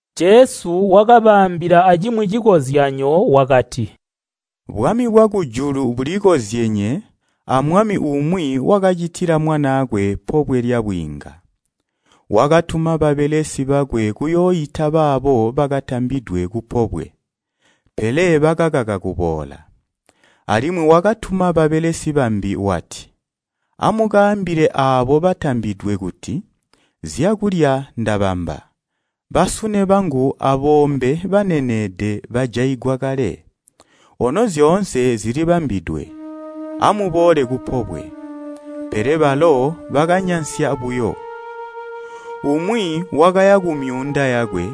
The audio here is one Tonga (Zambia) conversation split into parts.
Jesu wakabaambila acimwi cikozyanyo wakati, “Bwami bwakujulu bulikozyenye amwami umwi wakacitila mwanaakwe pobwe lyabwiinga. Wakatuma babelesi bakwe kuyooita baabo bakatambidwe kupobwe, pele bakaka kuboola. Alimwi wakatuma babelesi bambi wati, ‘Amukaambile aabo batambidwe kuti, zyakulya ndabamba. Basune bangu aboombe baneneede bajaigwa kale, ono zyoonse zilibambidwe. Amuboole kupobwe.’ Pele balo bakanyansya buyo. Umwi wakaya kumyuunda yakwe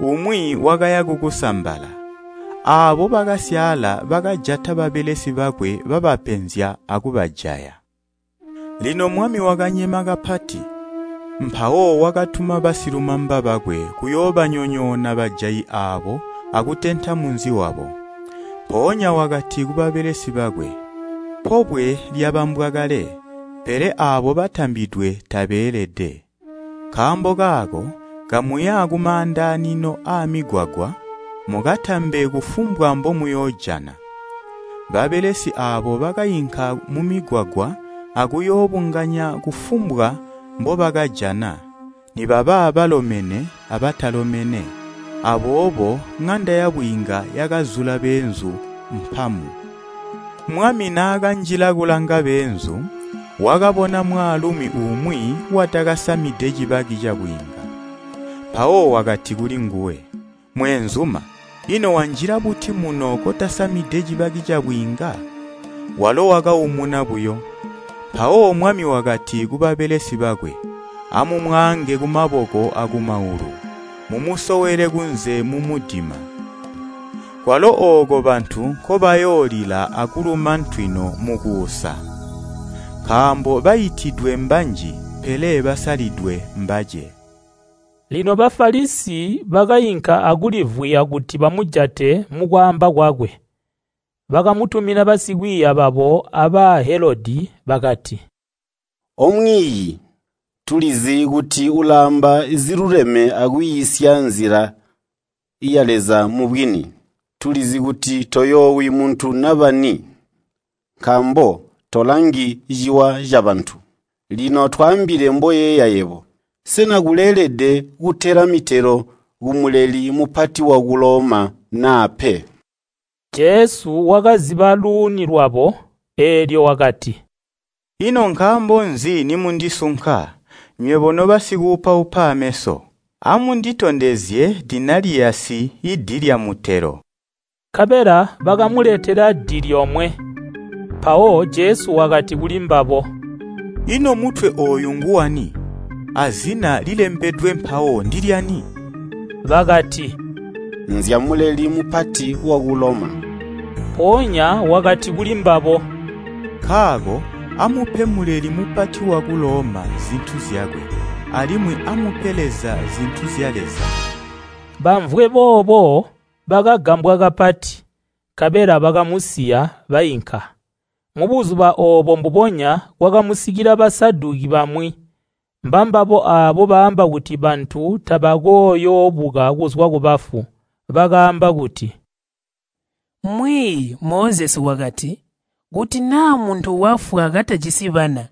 umwi wakaya kukusambala. Aabo bakasyaala bakajata babelesi bakwe babapenzya akubajaya. Lino mwami wakanyema kapati, mpawo wakatuma basilumamba bakwe kuyoobanyonyoona bajayi aabo akutenta munzi wabo. Mpoonya wakati kubabelesi bakwe. ‘Pobwe lyabambwa kale, pele aabo batambidwe tabeelede. Nkaambo kaako kamuya kumaandanino aamigwagwa, mukatambe kufumbwa mbomuyoojana!’ Babelesi aabo bakainka mumigwagwa akuyoobunganya kufumbwa mbobakajana, nibaba balomene abatalomene. Aboobo ŋanda yabwiinga yakazula beenzu mpamu. “Mwami naakanjila kulanga beenzu, wakabona mwaalumi umwi watakasamide cibaki cabwiinga. Mpawo wakati kulinguwe, ‘Mweenzuma, ino wanjila buti muno kotasamide cibaki cabwiinga?’ Walo wakaumuna buyo. Mpawo mwami wakati kubabelesi bakwe, ‘Amumwaange kumaboko akumaulu, mumusowele kunze mumudima. Kwalo ooko bantu nkobayoolila akuluma ntwino mukuusa!’ Nkaambo baitidwe mbanji pele basalidwe mbace.” Lino Bafalisi bakainka akulivwiya kuti bamujate mukwaamba kwakwe. Bakamutumina basikwiiya babo a Bahelodi, bakati, “O Mwiiyi, tulizi kuti ulaamba ziluleme akwiisya nzila ya Leza mubwini. Tulizi kuti toyoowi muntu naba ni, nkaambo tolangi ciwa cabantu. Lino twaambile mboyeeya yebo. Sena kuleelede kutela mitelo ku Muleli Mupati waku Loma naa pe?” Jesu wakaziba luuni lwabo, eelyo wakati, “Ino nkaambo nzi nimundisunka, nywebo nobasikuupaupa ameso? Amunditondezye mali aamutelo.” Nkabela bakamuletela di lyomwe. Mpawo Jesu wakati kulimbabo, “Ino mutwe ooyu nguwani, azina lilembedwe mpawo ndilyani?” Bakati, “Nzya Muleli Mupati waku Loma.” Mpoonya wakati kulimbabo, “Nkaako amupe Muleli Mupati waku Loma zintu zyakwe, alimwi amupe Leza zintu zya Leza.” Bamvwe boobo, bakagambwa kapati, nkabela bakamusiya, bainka. Mubuzuba oobo mbubonya kwakamusikila Basaduki bamwi, mbambabo aabo baamba kuti bantu tabakooyoobuka kuzwa kubafu. Bakaamba kuti, “Mwiiyi, Mozesi wakati, ‘Kuti naa muntu wafwa katajisi bana,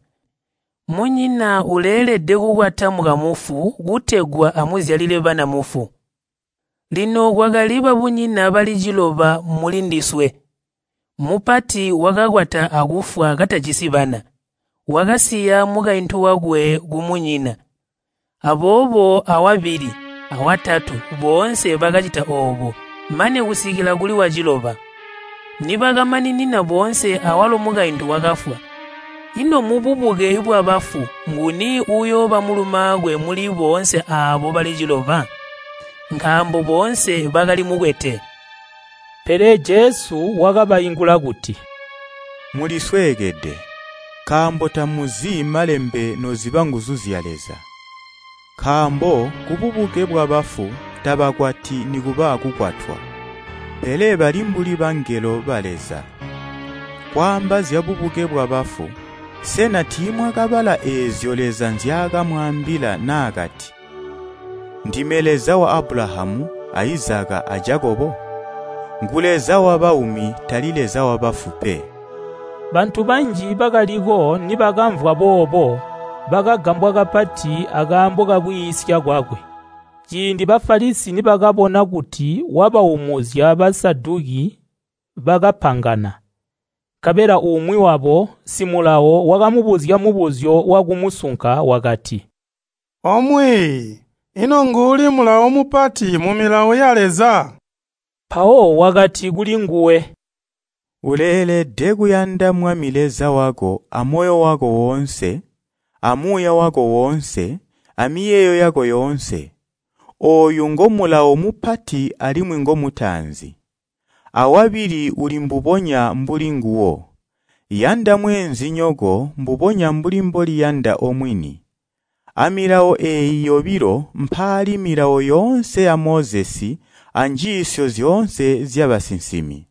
munyina uleelede kukwata mukamufu kutegwa amuzyalile bana mufu.’ Lino kwakali babunyina bali ciloba mulindiswe. Mupati wakakwata akufwa katajisi bana, wakasiya mukaintu wakwe kumunyina. Aboobo awabili, awatatu, boonse bakacita oobo, mane kusikila kuli waciloba. Nibakamaninina boonse awalo mukaintu wakafwa. Ino mububuke bwabafu, nguni uyooba mulumaakwe muli boonse aabo bali ciloba? Nkaambo boonse bakali mukwete.” Pele Jesu wakabaingula kuti, “Mulisweekede, nkaambo tamuzi Malembe noziba nguzu zya Leza. Nkaambo kububuke bwabafu tabakwati nikuba kukwatwa, pele bali mbuli bangelo ba Leza. Kwaamba zyabubuke bwabafu, sena tiimwakabala eezyo Leza nzyaakamwaambila naakati, ‘Ndime Leza wa Abulahamu a Izaka, a Jakobo?’ Ngu Leza wabaumi, tali wabafu pe.” Bantu banji bakaliko nibakamvwa boobo, bakagambwa kapati akaambo kakwiisya kwakwe. Ciindi Bafalisi nibakabona kuti wabaumuzya Basaduki bakapangana. Nkabela umwi wabo wakamubuzya mubuzyo wakumusunka wakati, “O Mwiiyi, ino nguuli mulawo mupati mu Milawo ya Leza?” Mpawo wakati kulinguwe, “Uleelede kuyanda Mwami Leza wako amoyo wako woonse, amuuya wako woonse, amiyeeyo yako yoonse. Ooyu ngomulawo mupati alimwi ngomutaanzi. Awabili uli mbubonya mbuli nguwo. Yanda mweenzinyoko mbubonya mbuli mboliyanda omwini. Amilawo eeyi yobilo mpaali milawo yoonse ya Mozesi anjiisyo zyoonse zyabasinsimi.”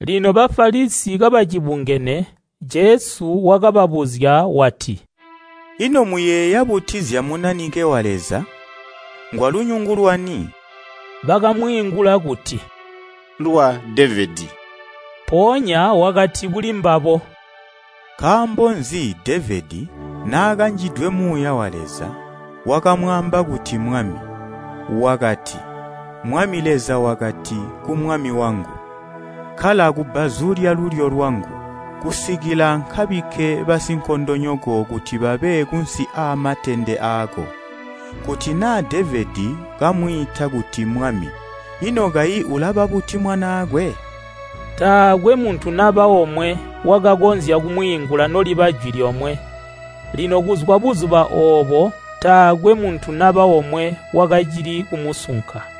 Lino Bafalisi kabacibungene, Jesu wakababuzya wati, “Ino muyeeya buti zya Munanike wa Leza? Ngwalunyungu lwani?” Bakamwiingula kuti, “Lwa Devedi.” Mpoonya wakati kulimbabo, “Nkaambo nzi Devedi, naakanjidwe Muuya wa Leza, wakamwaamba kuti Mwami. Wakati, ‘Mwami Leza wakati ku Mwami wangu, kkala kubbazu lyalulyo lwangu, kusikila nkabikke basinkondonyoko kuti babe kunsi aamatende aako.’ Kuti naa Devedi kamwiita kuti ‘Mwami’ ino kayi ulaba buti mwanaakwe?” Taakwe muntu naba omwe wakakonzya kumwiingula noliba jwi lyomwe. Lino kuzwa buzuba oobo taakwe muntu naba omwe wakacili kumusunka.